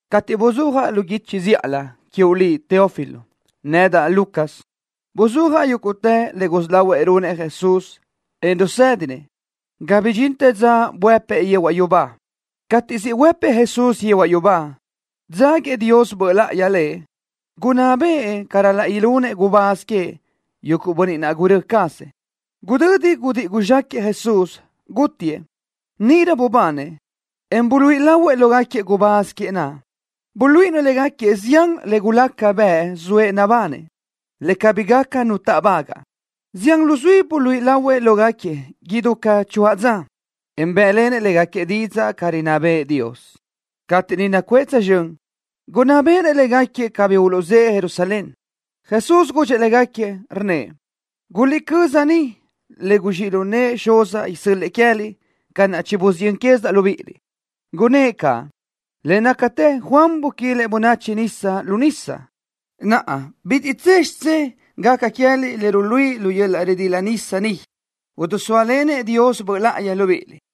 Cateʼ buzúajaʼ lu guichi zíʼalö, quiuʼ liʼ, Teófilo, nedaʼ, Lucas, buzúajaʼ yúguʼtë le gusí lahuëʼ runëʼ Jesús, en rusédinëʼ ga bidxintë dza buëpëʼ yehuaʼ yubá. Cateʼ siʼ huëpëʼ Jesús yehuaʼ yubá, dzáguiëʼ Dios Böʼ Láʼayi Lëʼ, gunná bëʼë ca ral-laʼ ilunëʼ gubáz queëʼ, yuguʼ bönniʼ naʼ gurö́ cazëʼ. Gudödi gudíʼi guzxáquëʼë Jesús, gútiëʼ. Níʼirö bubanëʼ, en buluíʼi lahuëʼ lógaquiëʼ gubáz queëʼ naʼ. Buluíʼinëʼ légaquiëʼ zián le gulaca bëʼ zoëʼ nabanëʼ, le cabí gaca nu táʼbagaʼ. Zián luzuí buluíʼi lahuëʼ lógaquiëʼ idú ca choáʼ dza, en bë́ʼlenëʼ légaquiëʼ didzaʼ ca rinná bëʼë Dios. Cateʼ niʼ nacuʼë tsözxö́n, gunná béʼenëʼ légaquiëʼ cabí uluʼzë́ʼë Jerusalén. Jesús gudxëʼ légaquiëʼ, rnnëʼ: —Guliʼcö́z niʼ le guzxíʼ lu nëʼë Xuzaʼ isö́l-lëʼë queë́liʼ ca naʼ chibusiyö́n quézidaʼ libíʼiliʼ. Gunnë́ʼ caʼ: —Le nácatë Juan buquilëʼ bönachi nisa lu nisa. Naʼa bitiʼ tse xidzé gaca queë́liʼ le ruluíʼi yöl-laʼ ridila nisa ni, idisóalenëʼ Dios Böʼ Láʼayi libíʼiliʼ.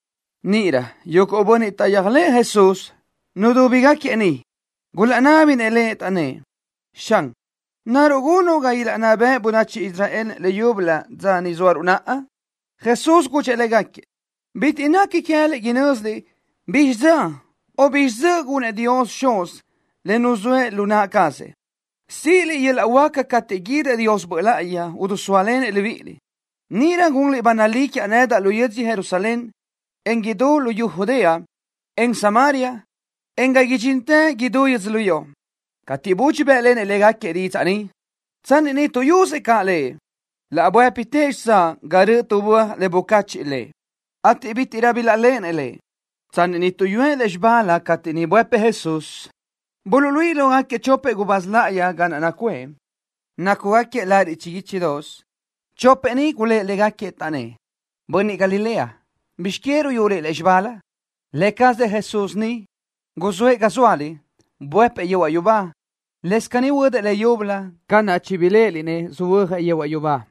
Níʼirö yuguʼ bönniʼ taʼyéajlëʼë Jesús, nudúbigaquiëʼ niʼ, gulaʼnábinëʼ Lëʼ, taʼnnë́ʼ: —Xan, ¿naruʼ gunuʼ ga ilaʼnná bëʼ bönachi Israel leyúbölö dza ni zóaruʼ naʼa? Jesús gudxëʼ légaquiëʼ: —Bitiʼ nequi queë́liʼ inö́ziliʼ bizxi dza o bizxi dzöʼ gunëʼ Dios Xuz le nuzóëʼ lu naʼ cazëʼ. Síʼiliʼ yöl-laʼ huáca cateʼ guídëʼ Dios Böʼ Láʼayi idisóalenëʼ libíʼiliʼ. Níʼirö gunliʼ ba nalí quiaʼ nedaʼ lu yödzö Jerusalén, en idú luyú Judea, en luyú Samaria, en ga idxíntëliʼ idútë yödzölió. Cateʼ budxi bë́ʼlenëʼ légaquiëʼ didzaʼ ni, tsanni niʼ tuʼyusëʼ caʼ Lëʼ, laʼ buë́pitëʼ xitsáʼ ga röʼö tu böaj le bucacheʼ Lëʼ, ateʼ bítiʼrö bilaʼléʼenëʼ Lëʼ. Tsanni niʼ tuʼyúëʼ lúzxibalö cateʼ niʼ buëpëʼ Jesús, buluʼluíʼi lógaquiëʼ chopëʼ gubáz láʼayi ga naʼ nacuʼë, nácugaquiëʼ lariʼ chiguíchidoʼos. Chopëʼ ni gulë́ʼ légaquiëʼ, taʼnnë́ʼ: —Bönniʼ Galilea, ¿bizx que ruyuliʼ lúzxibalö? Lë cazëʼ Jesús ni siʼ guzë́ʼë ga zóaliʼ, buëpëʼ yehuaʼ yubá, lëscaʼ caní huödëʼ leyúbölö ca naʼ chibiléʼeliʼ-nëʼ söhuö́jëʼ yehuaʼ yubá.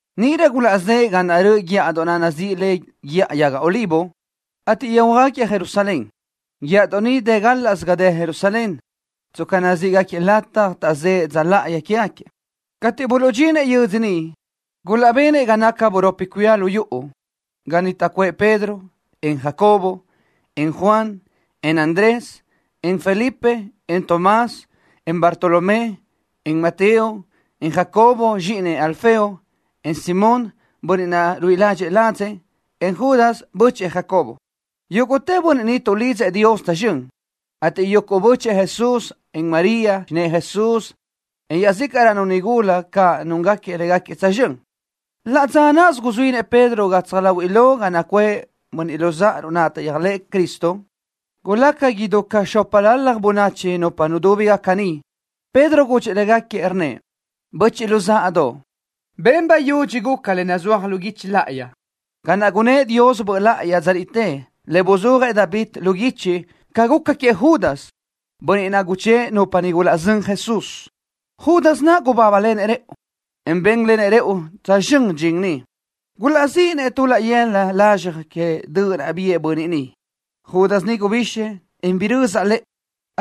Níʼirö gulaʼzë́ʼë ga naʼ röʼö guíʼadoʼ naʼ nazíʼi le Guíʼa Yaga Olivo, ateʼ yöjhuö́jgaquiëʼ Jerusalén. Guíʼadoʼ ni dë gálaʼsö ga dë Jerusalén, tsca nazíʼgaquiëʼ lataj taʼzë́ʼë dza láʼayi quégaquiëʼ. Cateʼ buluʼdxinëʼ yödzö niʼ, gulaʼbenëʼ ga naca buropi cuía lu yuʼu, ga niʼ taʼcuʼë Pedro, en Jacobo, en Juan, en Andrés, en Felipe en Tomás, en Bartolomé, en Mateo, en Jacobo, zxíʼinëʼ Alfeo, en Simón, bönniʼ naʼ ruíʼi ládxëʼë ladzëʼ, en Judas, bö́chëʼë Jacobo. Yúguʼtë bönniʼ ni tuʼlidzëʼ Dios tsözxö́n, ateʼ yuguʼ bö́chëʼë Jesús, en María, xinë́ʼë Jesús, en iaʼzícaʼrönu nigula caʼ núngaquiëʼ légaquiëʼ tsözxö́n. Laʼ dza náʼasö guzuínëʼ Pedro gatsaj láhuiʼlö ga nacuʼë böchiʼ luzáʼaruʼ naʼ taʼyéajlëʼë Cristo. Gulaca idú ca xópalalaj bönachi nupa nudúbigaca niʼ. Pedro gudxëʼ légaquiëʼ, rnnëʼ: —Böchiʼ luzáʼadoʼ. Ben bayudxi guca le nazúaj lu guichi láʼayi, ca naʼ gunnë́ʼ Dios Böʼ Láʼayi dza niʼtë, le buzúajëʼ David lu guichi, ca guca queëʼ Judas, bönniʼ naʼ guchë́ʼë nupa niʼ gulaʼzö́n Jesús. Judas naʼ gubábalenëʼ rëʼu, en bénlenëʼ rëʼu tsözxö́n dxin ni. Gulaʼzíʼinëʼ tu laʼ yëla lazxaj que döʼ naʼ biʼë bönniʼ ni. Judas ni gubixëʼ, en birözaʼ lëʼë,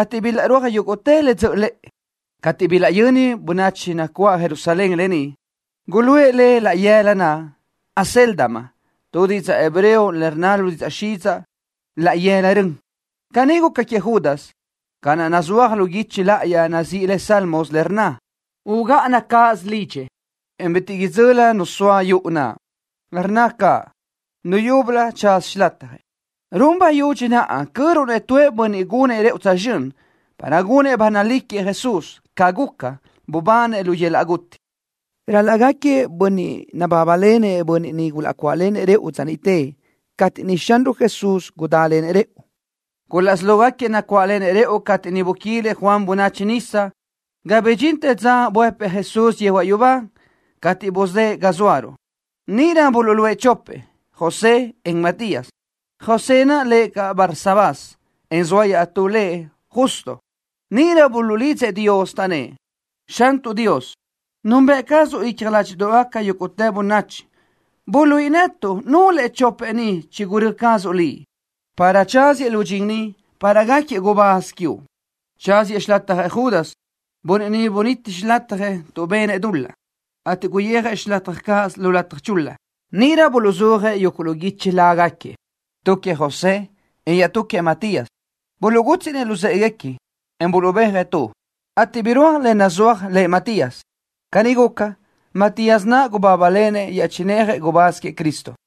ateʼ bilaʼrúaj yúguʼtë le dzöʼö lëʼë. Cateʼ bilaʼyöni bönachi nacuáʼ Jerusalén lë ni, guluʼë le laʼ yëla naʼ Acéldama, tu didzaʼ hebreo le rnna lu didzaʼ xidzaʼ: Laʼ Yëla Rön. Caní guca queëʼ Judas, ca naʼ nazúaj lu guichi láʼayi nazíʼi le Salmos, le rnna: Ugáʼana cáʼasö lidxëʼ, en bitiʼ idzöli nu soa yuʼu naʼ. Rnna caʼ: Nu yúbölö tsaza xilatjëʼ. ’Run bayudxi naʼa cöruʼ-nëʼ tu bönniʼ gunëʼ rëʼu tsözxö́n para gunëʼ ba nalí queëʼ Jesús, ca guca, bubanëʼ lu yöl-laʼ guti. Ral-laʼ gáquiëʼ bönniʼ nabábalenëʼ bönniʼ niʼ gulaʼcuáʼlenëʼ rëʼu dza niʼte cateʼ niʼ Xanruʼ Jesús gudálenëʼ rëʼu. Gulaʼsí lógaquiëʼ nacuáʼlenëʼ rëʼu cateʼ niʼ buquilëʼ Juan bönachi nisa, ga bidxintë dza buëpëʼ Jesús yehuaʼ yubá, cateʼ buzë́ʼë ga zóaruʼ. Níʼirö buluʼluʼë chopëʼ, José, en Matías. José naʼ lëʼ caʼ Barsabás, en zoa iaʼtú lëʼ Justo. Níʼirö buluʼlidzëʼ Dios, taʼnnë́ʼ: —Xantuʼ Dios, nunbëʼ cazuʼ icja ládxiʼdoʼgaca yúguʼtë bönachi. Buluíʼi netuʼ nulëʼ chopëʼ ni chigurö́ cazuʼ Liʼ para tsáziëʼ lu dxin ni para gáquiëʼ gubáz quiuʼ. Tsáziëʼ xilatjëʼ Judas, bönniʼ niʼ bunítiëʼ xilatjëʼ tuʼ benëʼ dul-laʼ, ateʼ guyijëʼ xilataj cazëʼ lataj chul-la. Níʼirö buluʼzúajëʼ yuguʼ lu guichi lágaquiëʼ, tu queëʼ José, en iaʼtú queëʼ Matías. Buluʼgútsiʼnëʼ luzë́ʼeguequi, en buluʼbéajëʼ tu, ateʼ birúaj le nazúaj lëʼ Matías. Caní guca, Matías naʼ gubábalenëʼ iaʼchinéajëʼ gubáz queëʼ Cristo.